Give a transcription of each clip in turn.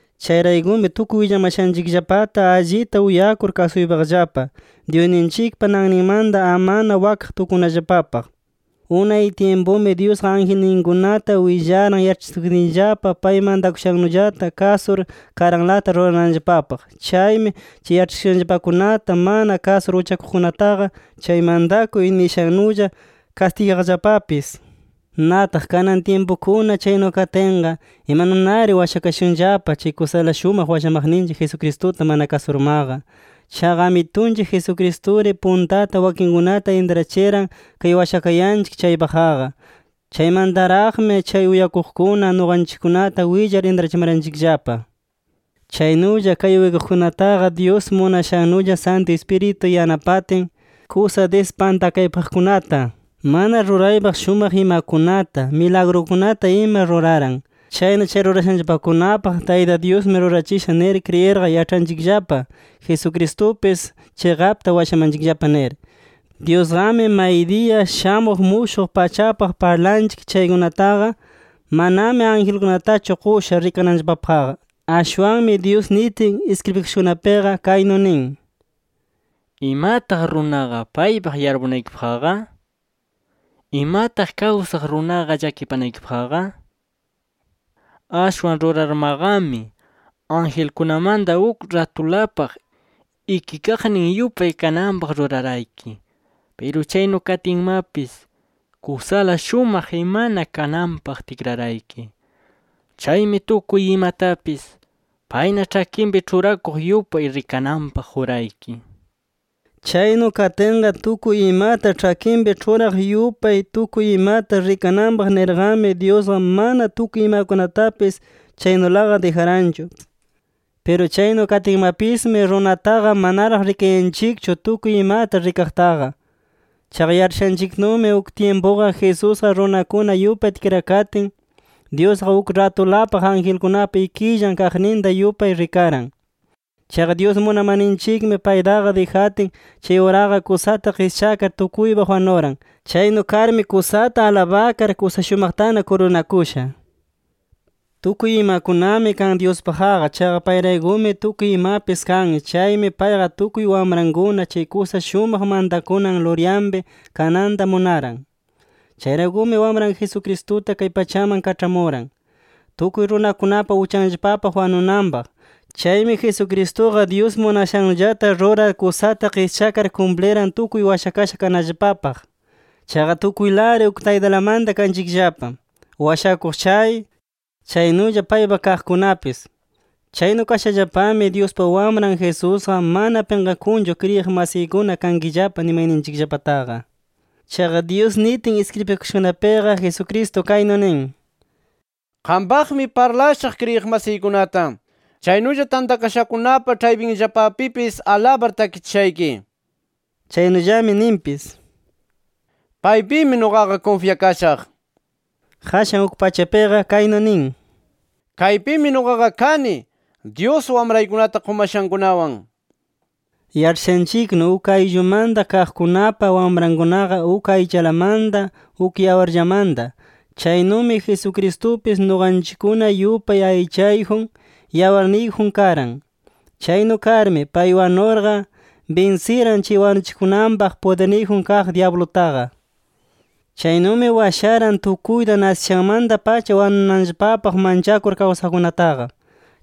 Chayraykumi tukuy willamashanchikllapata allita uyakur kasuypaqllapa, Dyusninchikpa nanninmanta amana wakaq tukunallapapaq. Unay tyimpumi Dyusqa angelninkunata willaran yaĉhachikutinllapa, pay mantakushannullata kasur, karanlata rurananllapapaq. Chaymi chay yaĉhachikushanllapakunata mana kasur uchakuqkunataqa, chay mantakuy nishannulla kastigaqllapapis. Nataq kanan tyimpukuna chaynu katinqa, ¿imanunari washakashunllapa, chay kusala shumaq washamaqninchik Jesucristuta mana kasurmaqa? Chaqa Amitunchik Jesucristuri puntata wakinkunata intrachiran kay washakayanchik chaypaqqa. Chaymantaraqmi chay uyakuqkuna nuqanchikkunata willar intrachimaranchikllapa. Chaynulla chay uyakuqkunataqa, Dyus munashannulla Santu Ispiritu yanapatin kusa dispantakaypaqkunata, mana ruraypaq shumaq imakunata, milagrukunata ima ruraran. Chayna chay rurashanllapakunapaq, Tayta Dyusmi rurachisha nir kriyirqa, yaĉhanchikllapa Jesucristupis chiqapta washamanchikllapa nir. Dyusqami maydiya shamuq mushuq pachapaq parlayanchik chaykunataqa, manami angelkunatachu qusha rikananllapapaqqa. Ashwanmi Dyus nitin iskribikashakunapiqa kaynu nin: “¿Imataq runaqa paypaq yarpunaykipaqqa? ¿Imataq kawsaq runaqa llakipanaykipaqqa? Ashwan rurarmaqami, angelkunamanta uk ratulapaq ikikaqnin yupay kananpaq rurarayki. Piru chaynu katinmapis, kusala shumaq imana kananpaq tikrarayki. Chaymi tukuy imatapis, payna ĉhakinpi ĉhurakuq yupay rikananpaq qurayki” nir. Chaynu katinqa tukuy imata ĉhakinpi ĉhuraq yupay tukuy imata rikananpaq nirqami, Dyusqa mana tukuy imakunatapis chaynulaqa dijaranchu. Piru chaynu katinmapismi, runataqa manaraq rikayanchikchu tukuy imata rikaqtaqa. Chaqa yaĉhashanchiknumi, uk tyimpuqa Jesusqa runakuna yupay tikrakatin, Dyusqa uk ratulapaq angelkunapa ikillan kaqninta yupay rikaran. Chaqa Dyus munamarninchikmi paytaqa dijatin, chay uraqa kusata qischakar tukuypaq wanuran. Chaynu karmi kusata alabakar, kusa shumaqtana kurunakusha. Tukuy imakunami kan Dyuspaqqa. Chaqa payraykumi tukuy imapis kan. Chaymi payqa, tukuy wamrankuna chay kusa shumaq mantakunan Luryanpi kananta munaran. Chayraykumi Wamran Jesucristuta kay pachaman kaĉhamuran, tukuy runakunapa uchanllapapaq wanunanpaq. Chaymi Jesucristuqa, Dyus munashannullata rurar kusata qischakar kumpliran, tukuy washakasha kananllapapaq. Chaqa tukuylari uk taytalamanta kanchikllapa, washakuq chay, chaynulla paypa kaqkunapis. Chaynu kashallapami Dyuspa Wamran Jesusqa, mana pinqakunchu kriyiq masiykuna kankillapa nimayninchikllapataqa. Chaqa Dyus nitin iskribikashakunapiqa Jesucristo kaynu nin: “Qampaqmi parlashaq kriyiq masiykunata. Chaynulla tantakashakunapa ĉhaypinllapapipis alabar takichishayki” nir. Chaynullami ninpis: “Paypimi nuqaqa kunfyakashaq” nir. Qashan uk pachapiqa kaynu nin: “Kaypimi nuqaqa kani, Dyus wamraykunata qumashankunawan” nir. Yaĉhashanchiknu uk ayllumanta kaqkunapa wamrankunaqa uk aychalamanta, uk yawarllamanta. Chaynumi Jesucristupis nuqanchikkuna yupay aychayjun, yawarniyjun karan. Chaynu karmi pay wanurqa, binsiran chay wanuchikunanpaq pudirniyjun kaq dyablutaqa. Chaynumi washaran tukuyta, nasishanmanta-pacha wanunanllapapaq manchakur kawsaqkunataqa.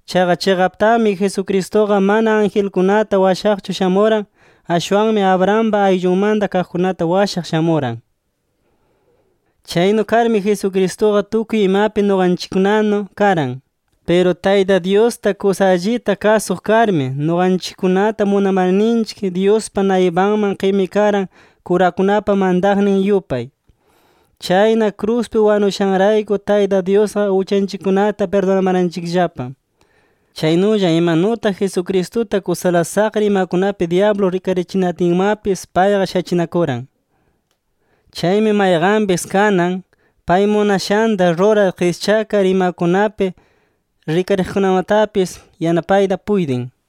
Chaqa chiqaptami Jesucristuqa mana angelkunata washaqchu shamuran. Ashwanmi Abrahampa ayllunmanta kaqkunata washaq shamuran. Chaynu karmi Jesucristuqa tukuy imapi nuqanchikkunanu karan. Piru Tayta Dyusta kusa allita kasuq karmi, nuqanchikkunata munamarninchik Dyuspa naypanman qimikaran kurakunapa mantaqnin yupay. Chayna kruspi wanushanrayku Tayta Dyusqa uchanchikkunata pirdunamaranchikllapa. Chaynulla, imanutaq Jesucristuta kusala saqra imakunapi dyablu rikarichinatinmapis payqa shachinakuran. Chaymi mayqanpis kanan, pay munashanta rurar qischakar imakunapi rikariqkunamatapis, yanapayta puytin.